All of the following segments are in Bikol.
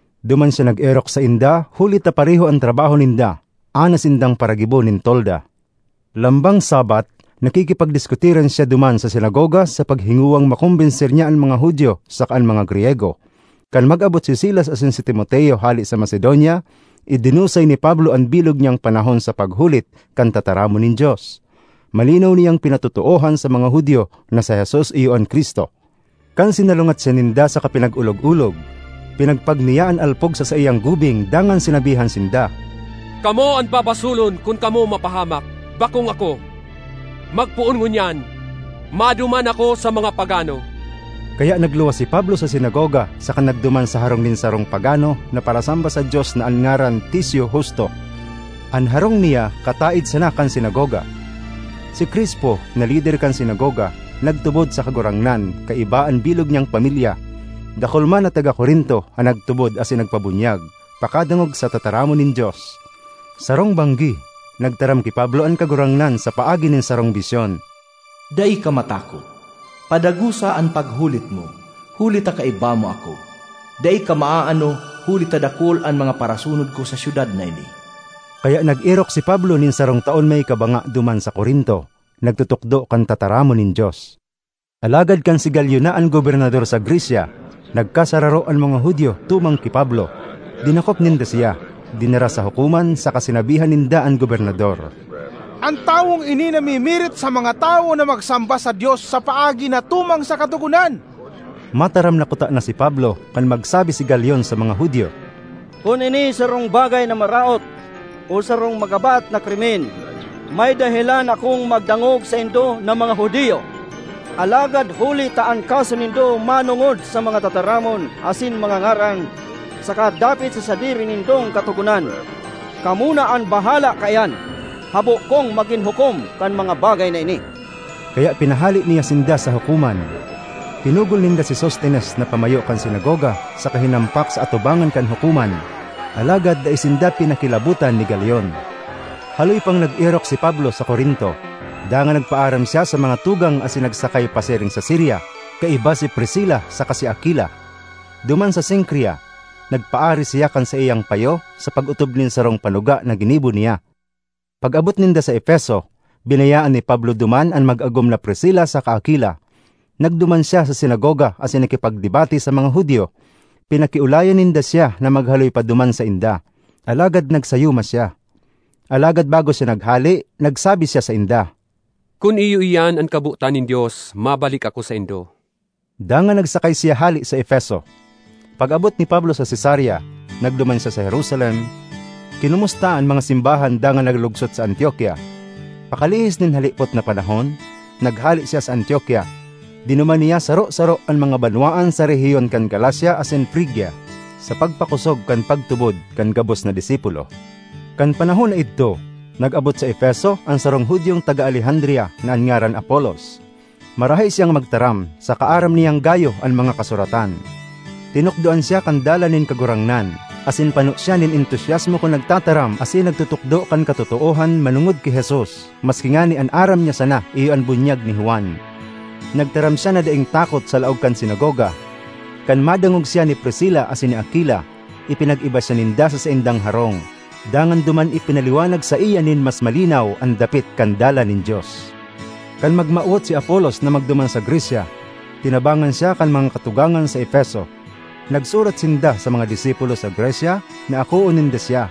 Duman siya nag-erok sainda huli ta pareho an trabaho ninda, anas sindang paragibo nin tolda. Lambang Sabbath, nakikipagdiskutiran siya duman sa sinagoga sa paghingowang makombenser niya an mga Judio saka an mga Griyego. Kan mag-abot si Silas asin si Timoteo hale sa Macedonia, idinusay ni Pablo an bilog niyang panahon sa paghulit kan tataramon nin Dios. Malinaw niyang pinatotoohan sa mga Judio na si Jesus iyo an Cristo. Kan sinalungat siya ninda saka pinag-olog-olog, pinagpag niya an alpog sa saiyang gubing dangan sinabihan sinda, “Kamo an babasolon kun kamo mapahamak; bakong ako! Magpoon ngunyan, maduman ako sa mga pagano.” Kaya nagluwas si Pablo sa sinagoga saka nagduman sa harong nin sarong pagano na parasamba sa Dios na an ngaran Ticio Justo. An harong niya kataed sana kan sinagoga. Si Crispo, na lider kan sinagoga, nagtubod sa Kagurangnan kaiba an bilog niyang pamilya. Dakul man na taga Corinto an nagtubod asin nagpabunyag pakadangog sa tataramon nin Dios. Sarong banggi, nagtaram ki Pablo an Kagurangnan sa paagi nin sarong bisyon, “Dai ka matakot; padagosa an paghulit mo huli ta kaiba mo ako. Dai ka maaano huli ta dakul an mga parasunod ko sa syudad na ini.” Kaya nag-erok si Pablo nin sarong taon may kabanga duman sa Corinto, nagtutukdo kan tataramon nin Dios. Alagad kan si Galion na an gobernador sa Grecia, nagkasararo an mga Judio tumang ki Pablo. Dinakop ninda siya, dinara sa hukoman saka sinabihan ninda an gobernador, “An tawong ini namimirit sa mga tawo na magsamba sa Dios sa paagi na tumang sa katogonan!” Mataram na kutana si Pablo, kan magsabi si Galion sa mga Judio, “Kun ini sarong bagay na maraot o sarong magabat na krimen, may dahelan akong magdangog saindo na mga Judio. Alagad huli ta an kaso nindo manongod sa mga tataramon asin mga ngaran, saka dapit sa sadiri nindong katogonan, kamo na an bahala kaiyan; habo kong magin hukom kan mga bagay na ini!” Kaya pinahale niya sinda sa hukoman. Pinugol ninda si Sostenes na pamayo kan sinagoga saka hinampak sa atubangan kan hukoman. Alagad dai sinda pinakilabotan ni Galion. Haloy pang nag-erok si Pablo sa Corinto; dangan nagpaaram siya sa mga tugang asin nagsakay pasiring sa Siria kaiba si Priscila saka si Aquila. Duman sa Cencrea, nagpaaris siya kan saiyang payo sa pag-otob nin sarong panuga na ginibo niya. Pag-abot ninda sa Efeso, binayaan ni Pablo duman an mag-agom na Priscila saka Aquila. Nagduman siya sa sinagoga asin nakipagdebate sa mga Judio. Pinakiolayan ninda siya na maghaloy pa duman sainda, alagad nagsayuma siya. Alagad bago siya naghale, nagsabi siya sainda, “Kun iyo iyan an kabotan nin Dios, mabalik ako saindo.” Dangan nagsakay siya hale sa Efeso. Pag-abot ni Pablo sa Cesarea, nagduman siya sa Jerusalem, kinomusta an mga simbahan dangan naglugsot sa Antiokia. Pakalihis nin halipot na panahon, naghale siya sa Antiokia; dinuman niya saro-saro an mga banwaan sa rehiyon kan Galacia asin Frigia, sa pagpakosog kan pagtubod kan gabos na disipulo. Kan panahon na idto, nag-abot sa Efeso an sarong Judiong taga Alejandria na an ngaran Apolos. Marahay siyang magtaram saka aram niyang gayo an mga Kasuratan. Tinukdoan siya kan Dalan nin Kagurangnan, asin pano siya nin entusiasmo kun nagtataram asin nagtutukdo kan katotoohan manongod ki Jesus maski ngani an aram niya sana iyo an bunyag ni Juan. Nagtaram siya na daing takot sa laog kan sinagoga. Kan madangog siya ni Priscila asin ni Aquila, ipinag-iba siya ninda sa saindang harong, dangan duman ipinaliwanag saiya nin mas malinaw an dapit kan Dalan nin Dios. Kan magmawot si Apolos na magduman sa Grecia, tinabangan siya kan mga katugangan sa Efeso. Nagsurat sinda sa mga disipulo sa Grecia na akoon ninda siya.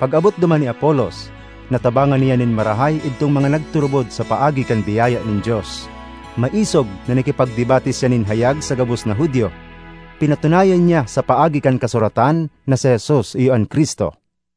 Pag-abot duman ni Apolos, natabangan niya nin marahay idtong mga nagturubod sa paagi kan biyaya nin Dios. Maisog na nakipagdebate siya nin hayag sa gabos na Judio; pinatunayan niya, sa paagi kan Kasuratan, na si Jesus iyo an Cristo.